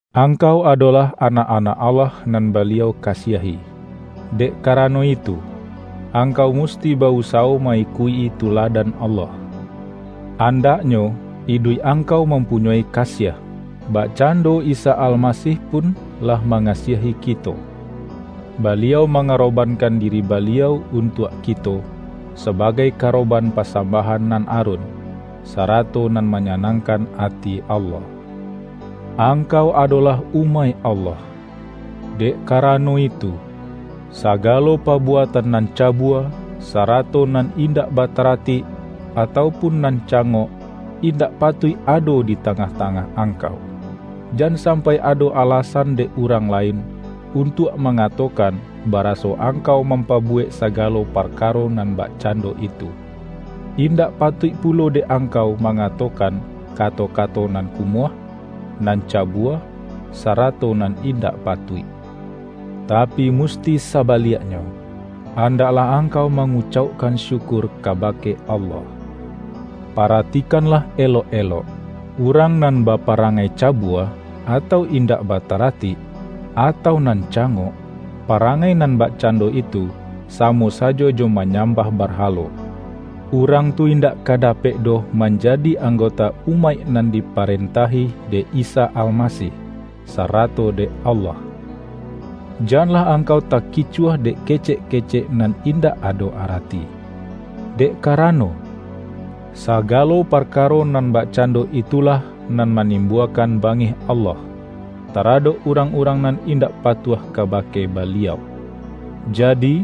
Angkau adolah anak-anak Allah nan Baliau kasiahi, dek karano itu, angkau musti ba-usawo ma-ikuik-i tuladan Allah. Andaknyo iduik angkau mampunyoi kasiah, bakcando Isa Almasih pun lah mangasiahi kito. Ba-liau mangarobankan diri Baliau untuak kito, sabagai karoban pasambahan nan arun, sarato nan manyanangkan ati Allah. Angkau adolah umaik Allah. Dek karano itu, sagalo pabuatan nan ca-bua, sarato nan indak bataratik, atau pun nan cangok, indak patuik ado di tangah-tangah angkau. Jan sampai ado alasan dek urang lain, untuak ma-ngatokan baraso angkau mampabu-wek sagalo parkaro nan bakcando itu. Indak patuik pulo dek angkau ma-ngatokan kato-kato nan kumuah, nan cabua, sarato nan indak patuik. Tapi musti sabaliaknyo, andaklah angkau mangucaukkan syukur kabake Allah. Paratikanlah elok-elok: urang nan baparangai cabua, atau indak bata-ratik, atau nan cangok (parangai nan bakcando itu, samo sajo jo manyam-bah barhalo), urang tu indak ka da-pek doh manjadi anggota umaik nan diparentahi dek Isa Almasih, sarato dek Allah. Janlah angkau takicuah dek ke-cek-kecek nan indak ado arati. Dek karano, sagalo parkaro nan bakcan-do itulah nan manimbuakan bangih Allah, taradok urang-urang nan indak patuah kabake Baliau. Jadi,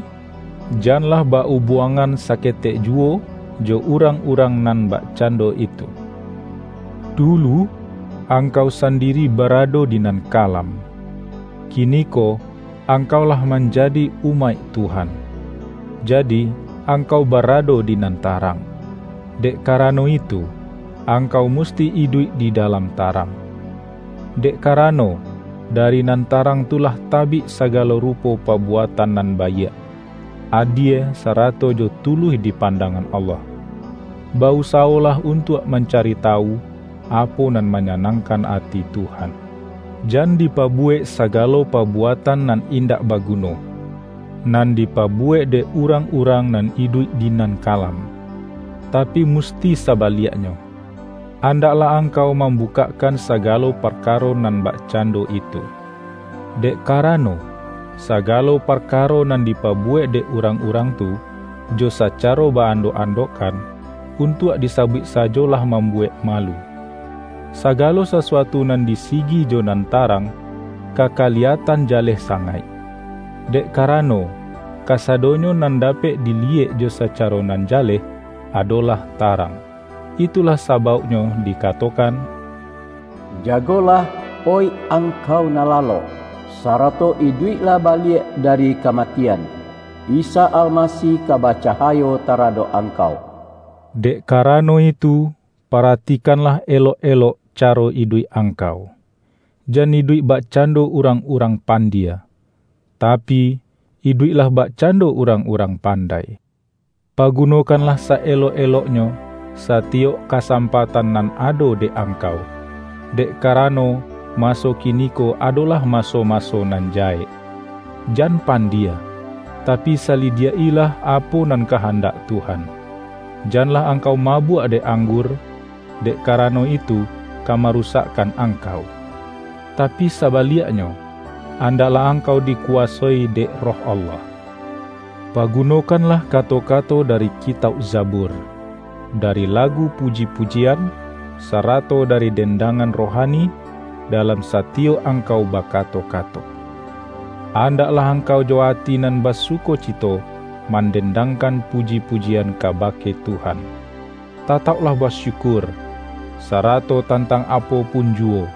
janlah ba-ubuangan saketek juwo, jo urang-urang nan bakcando itu. Dulu, ang-kau sandiri barado di nan kalam. Kini-ko angkau lah manjadi umaik Tuhan, jadi angkau barado di nan tarang. Dek karano itu, angkau musti iduik di da-lam tarang. Dek karano, dari nan ta-rang tu lah tabik sagalo rupo pabu-atan nan baiak, adie sarato jo tuluih di pandangan Allah. Ba-usawolah un-tuak mancari tawu, apo nan manya-nangkan ati Tuhan. Jan dipabuwek sagalo pabuatan nan indak baguno, nan dipabuwek dek urang-urang nan iduik di nan kalam. Tapi musti saba-liaknyo, andaklah angkau mambukak-kan sagalo parkaro nan bakcando itu. Dek karano, sagalo parkaro nan di-pabuwek dek urang-urang tu jo sacaro ba-andok-andokkan, untuak disabuik sajo lah mambuwek malu.) Sagalo sasuatu nan disigi jo nan tarang, ka kaliyatan jaleh sangaik. Dek kara-no, kasadonyo nan dapek diliyek jo sacaro nan jaleh, adolah tarang. Itu-lah sabauknyo dikatokan,”Jagolah, oih angkau nan lalok, sarato iduiklah baliak dari kamatian! Isa Almasih ka bacahayo taradok angkau.” Dek karano itu, paratikanlah elok-elok caro iduik angkau. Jan iduik bak-cando urang-urang pandie; tapi, iduik-lah bakcando urang-urang pandai. Pagunokanlah sa-elok-eloknyo, sa-tiyok kasampatan nan ado dek angkau, dek karano maso kiniko adolah maso-maso nan jahek. Jan pandie, tapi sa-lidiak-ilah apo nan kahandak Tuhan. Janlah angkau mabuak dek ang-gur, dek karano itu ka marusakkan angkau. Tapi sabaliaknyo, andaklah angkau dikuwasoi dek Roh Allah. Pa-gunokanlah kato-kato dari kitauk Za-bur, dari lagu puji-pujian, sarato dari dendangan rohani, dalam satiyok ang-kau bakato-kato. Andaklah angkau jo ati nan basukocito mandendangkan pu-ji-pujian kabake Tuhan. Tatauklah basyukur, sarato tantang apo pun ju-wo,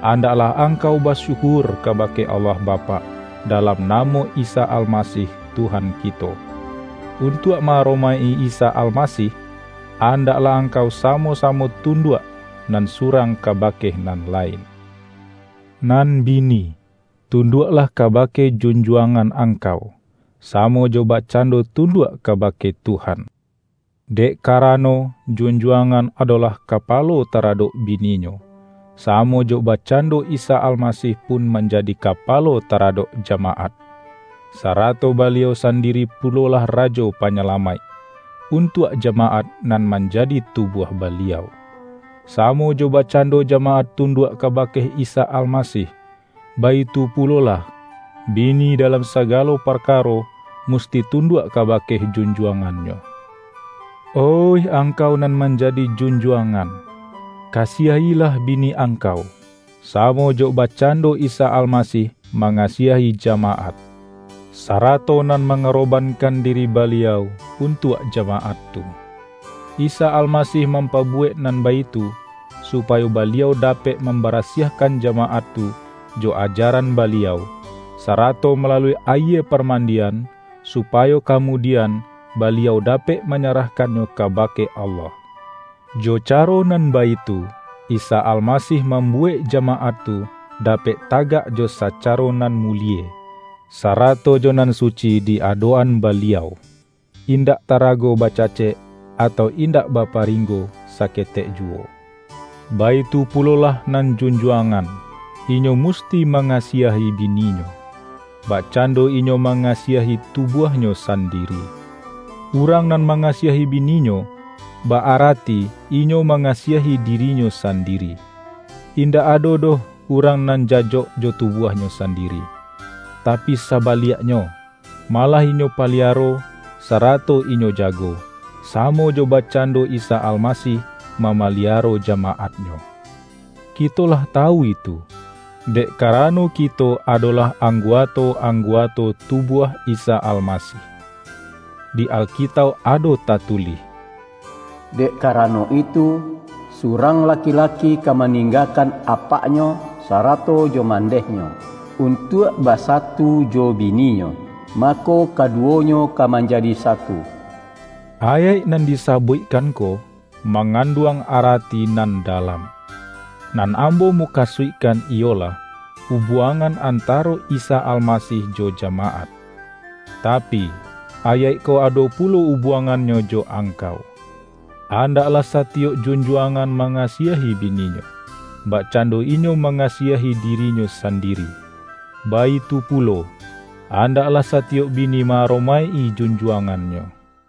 andaklah angkau basyukur kabake Allah Bapak, dalam namo Isa Almasih Tuhan kito. Untuak ma-aromaik-i Isa Almasih, andaklah angkau samo-samo tunduak nan surang kabake nan lain. Nan bini, tunduaklah kabake jun-juangan angkau, samo jo bakcando tunduak kabake Tuhan. Dek karano, junjuangan adolah kapalo taradok bi-ninyo, samo jo bakcando Isa Almasih pun manjadi Kapalo taradok jamaat, sarato Baliau sandiri pulolah Rajo Pa-nyalamaik, untuak jamaat nan manja-di tubuah Baliau. Samo jo bakcando jamaat tunduak kabake Isa Almasih, baitu pulolah, bini dalam sagalo par-karo musti tunduak kabake junjuang-annyo. Oih angkau nan manjadi junjuang-an, kasiahilah bini angkau, samo jo bakcando Isa Almasih mangasiahi ja-maat, sarato nan mangarobankan diri Baliau untuak jamaat tu. Isa Almasih mampabuwek nan baitu, supayo Ba-liau dapek mambarasiahkan jamaat tu jo ajaran Baliau, sarato malalui ayie parmandian, supayo kamudian Baliau dapek manyarahkannyo kabake Allah. Jo caro nan baitu, Isa Almasih mam-buwek jamaat tu dapek tagak jo sa-caro nan mulie, sarato jo nan suci di adok-an Baliau, indak tarago bacacek, atau indak baparinggo saketek juwo. Baitu pulolah nan junjuangan, inyo musti mangasiahi bininyo, bakcando inyo mangasiahi tubuahnyo sandiri. Urang nan mangasiahi bininyo, ba-arati inyo mangasiahi dirinyo sandi-ri. Indak ado doh urang nan jajok jo tubuahnyo sandiri. Tapi sabaliak-nyo, malah inyo paliaro, sarato inyo jago, samo jo bakcando Isa Almasih mamaliaro jamaat-Nyo. Kito lah ta-wu itu, dek karano kito adolah ang-guato-angguato tubuah Isa Almasih.) Di Alkitauk ado tatulih,”Dek kara-no itu, surang laki-laki ka maningga-kan apaknyo sarato jo mandehnyo, untuak basatu jo bininyo, mako kadu-wonyo ka manjadi satu.” Ayaik nan disabuikkan ko, manganduang arati nan dalam. Nan ambo mukasuikkan iyolah, ubuangan antaro Isa Almasih jo jamaat. Tapi, ayaik ko ado pulo ubuangannyo jo angkau: Andaklah sa-tiyok junjuangan mangasiahi bininyo, bakcando inyo mangasiahi dirinyo san-diri, baitu pulo, andaklah satiyok bini ma-aromaik-i junjuangannyo.